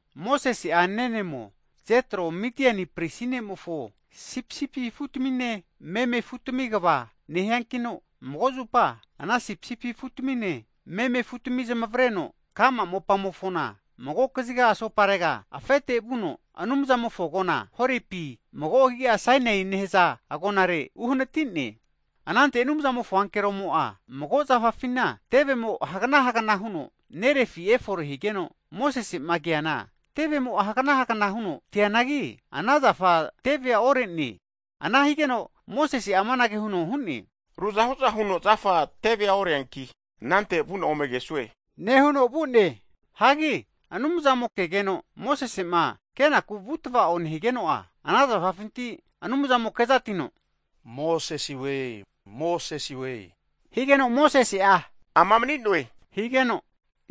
Mosese'a nenemo, Jetro Midiani pristi ne'mofo sipisipi afu tamine meme afutami kva nehiankino, mago zupa, ana sipisipi afutamine meme afutami zamavareno ka'ma mopamofona mago kaziga asoparega afete vuno Anumzamofo agona, Horepi mago agi'a Sainaie nehaza agonare uhanati'ne. Anante Anumzamofo ankeromo'a, mago zafafina tevemo hagana hagana huno nerefi efore higeno, Mosese'ma keana tevemo'a hagana hagana huno te'neanagi, ana zafa tevea ore'ne. Ana higeno Mosese'a amanage huno hu'ne, Ruzahu'za huno zafa tevea oreanki, anante vu'na ome kesue nehuno vu'ne. Hagi Anumzamo'ma kegeno Mosese'ma kenaku vutava'o nehigeno'a, ana zafafinti Anumzamo'a kezatino, Mosesewe! Mosesewe! higeno Mosese'a ama mani'noe higeno,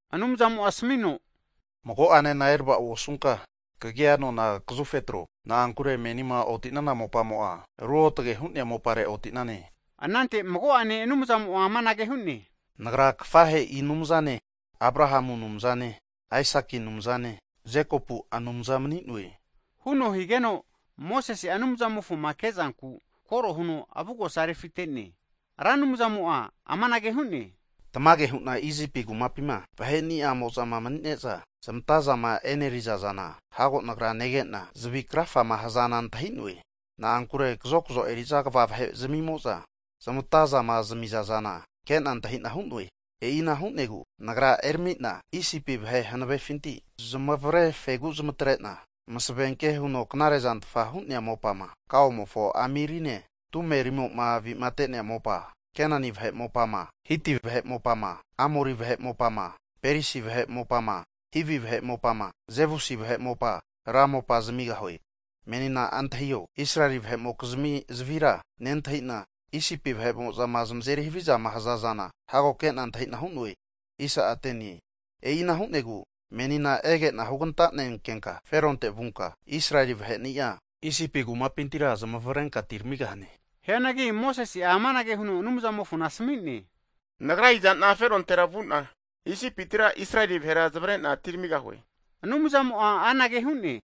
Anumzamo'a asmino, Mago'anena eravao osunka, kagia anona kazufe atro, na'ankure menima oti'nana mopamo'a ruotage hu'nea mopare oti'nane. Anante mago'ane Anumzamo'a amanage hu'ne, Nagra kafahe'i Anumzane, Abrahamu Anumzane, Aisaki Anumzane Jekopu Anumza mani'noe, huno higeno Mosese'a Anumzamofoma ke'zanku koro huno avugosa refite'ne. Ra Anumzamo'a amanage hu'ne, tamage hu'na Isipi kumapi'ma vahe'niamo'zama mani'ne'za zmatazama e'neri'za zana, hago Nagra nege'na, zavi krafama hazana antahi'noe. Na'ankure kazokzo eri'za kva vahe zami'mo'za, zmatazama zamizazana ke'na antahi'na hu'noe. E'ina hu'negu, Nagra erami'na Isipi vahe hanavefinti zamavre fegu'a zmatre'na, masavenke huno knare zantfa hu'nea mopama, kaomofo amirine tumerimo'ma avi'mate'nea mopa Kenani vahe mopama, Hiti vahe mopama Amori vahe mopama Perisi vahe mopama, Hivi vahe mopama Jebusi vahe mopa, ra mopa zamigahue. Menina antahio, Israeli vahe'mokizmi zavira nentahi'na, Isipi ma zamazeri havizama haza zana hago ke'na antahi'na hu'noe. E'ina hu'negu menina ege'na huganta'nenkenka Feronte vunka, Israeli vahe'ni'a, Isipi kumapintira zmavrenka atiramigahane. Hianagi Mosese'a amanage huno Anumzamofona asmi'ne, Nagra iza'na Ferontera vu'na Isipitira, Israeli vahera zamavare'na atiramigahue? Anumzamo'a anage hu'ne,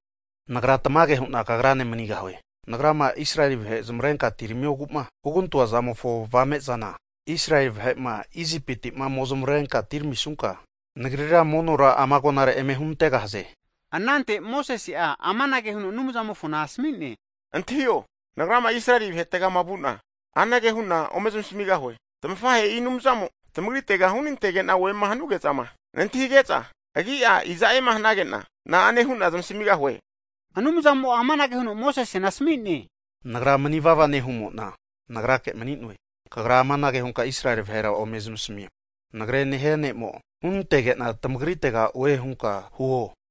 Nagra tamage hu'na kagrane manigahue. Nagrama Israeli vahe zmavrenka atiramiogu'ma hugantoa zamofo avame'zana, Israeli vahe'ma Isipiti'ma ome zmavrenka atiramisunka, Nagrira monora ama agonare eme hunantegahaze. Anante Mosese'a amanage huno Anumzamofona asmi'ne, Antahio, nagrama Israeli vahetegama vu'na, anage hu'na ome zmasamigahue, tamafahe'i Anumzamo tamagritega hunantege'na oema hanuge'zama nantahige'za, agi'a iza'ema hanage'na? na'ane hu'na zamasamigahue? Higeno Anumzamo'a amanage huno Mosesena asmi'ne, Nagra mani vava nehumo'na Nagrake Mani'noe, kagra amanage hunka Israeli vahera ome zamasamio, Nagre nehia ne'mo, hunantege'na tamagritega oe hunka huo.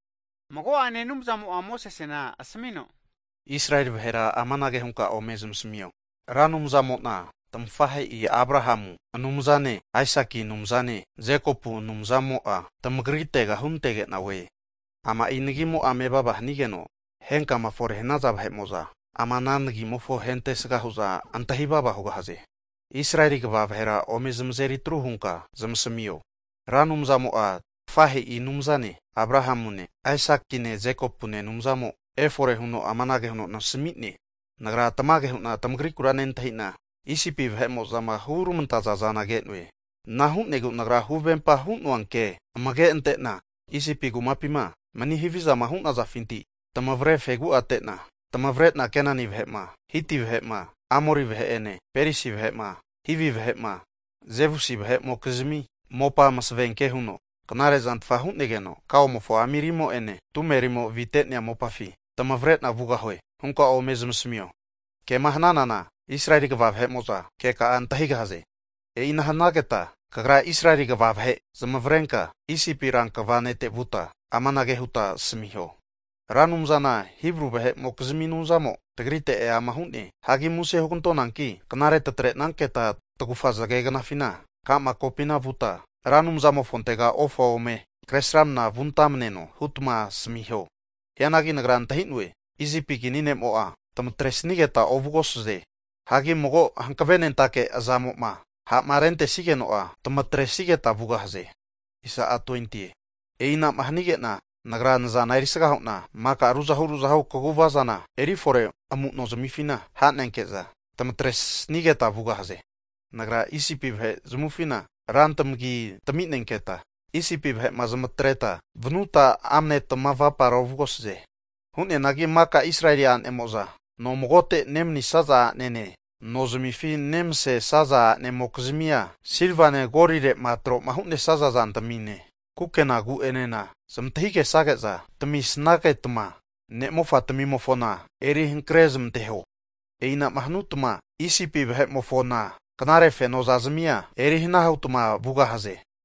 Mago'ane Anumzamo'a Mosesena asmino, Israeli vahera amanage hunka ome zamasamio, Ra Anumzamo'na tamafahe'i Abrahamu Anumzane, Aisaki Anumzane, Jekopu Anumzamo'a tamagritega hunantege'na oe. Ama'i nagimo'a mevava hanigeno, henkama fore'ma hanaza vahe'mo'za ama ana nagimofona ahentesga hu'za antahinami vava hugahaze. Israeli kva vahera ome zamazeri tru hunka zmasmio, Ra Anumzamo'a tamafahe'i Anumzane, Abrahamune Aisakine Jekopune Anumzamo efore huno amanage huno nasami'ne, Nagra tamage hu'na tamagrikura nentahi'na, Isipi vahe'mo'zama hurmantaza zana ke'noe. Ana hu'negu Nagra huvempa hu'noa ke amage ante'na Isipi kumapima mani havizama hu'nazafinti tamavre fegu'ate'na tamavre'na Keneni vahe'ma, Hiti vahe'ma, Amori vahe'ene, Perisi vahe'ma, Hivi vahe'ma Jebusi vahe'mokizmi mopa masevenke huno knare zanfta hu'negeno, kaomofo amirimo'ene tumerimo avite'nea mopafi tamavreno vugahie hunka ome zamasamio. Kema hananana, Israeli kva vahe'mo'za ke ka'a antahigahaze. E'ina hnageta kagra Israeli kva vahe zamavrenka Isipi rankva nete vuta amanage huta asamiho, Ra Anumzana Hibru vahe'mokizmi Anumzamo tagrite eama hu'ne. Hagi muse hugantonanki knare tatrenanketa tagufa zagegnafina ka'ma kopina vuta Ra Anumzatimofontega ofa ome kre sramana vuntamaneno hutma asamiho. Hianagi Nagra antahi'noe, Isipi kini ne'mo'a tamatresnigeta ovugosaze. Hagi mago hankvenentake azamo'ma ha'ma rentesnigeno'a tmatresnigeta vugahaze. E'inama hanige'na Nagra nazana erisga hu'na maka ruzahu ruzahu kaguvazana eri fore amu'no zamifina ha'nenke'za, tamatresnigeta vugahaze. Nagra Isipi vahe zamufina rantamagi taminenketa Isipi vahe'ma zamatreta, vanuta amne tamavapara ovugahaze. Hu'neanagi maka Israeli a'nemo'za no magote nemanisnaza a'nanene no zamifi nemsesnaza a'ne'mokizmia silvane golire'ma tro'ma hu'nesaza zantamine, kukenagu enena zmantahigesage'za tamisagetma, ne' mofatmimofona eri hankre zmanteho. E'inama hanutma Isipi vahe'mofona knare fenozazamia eri hana hutma vugahaze.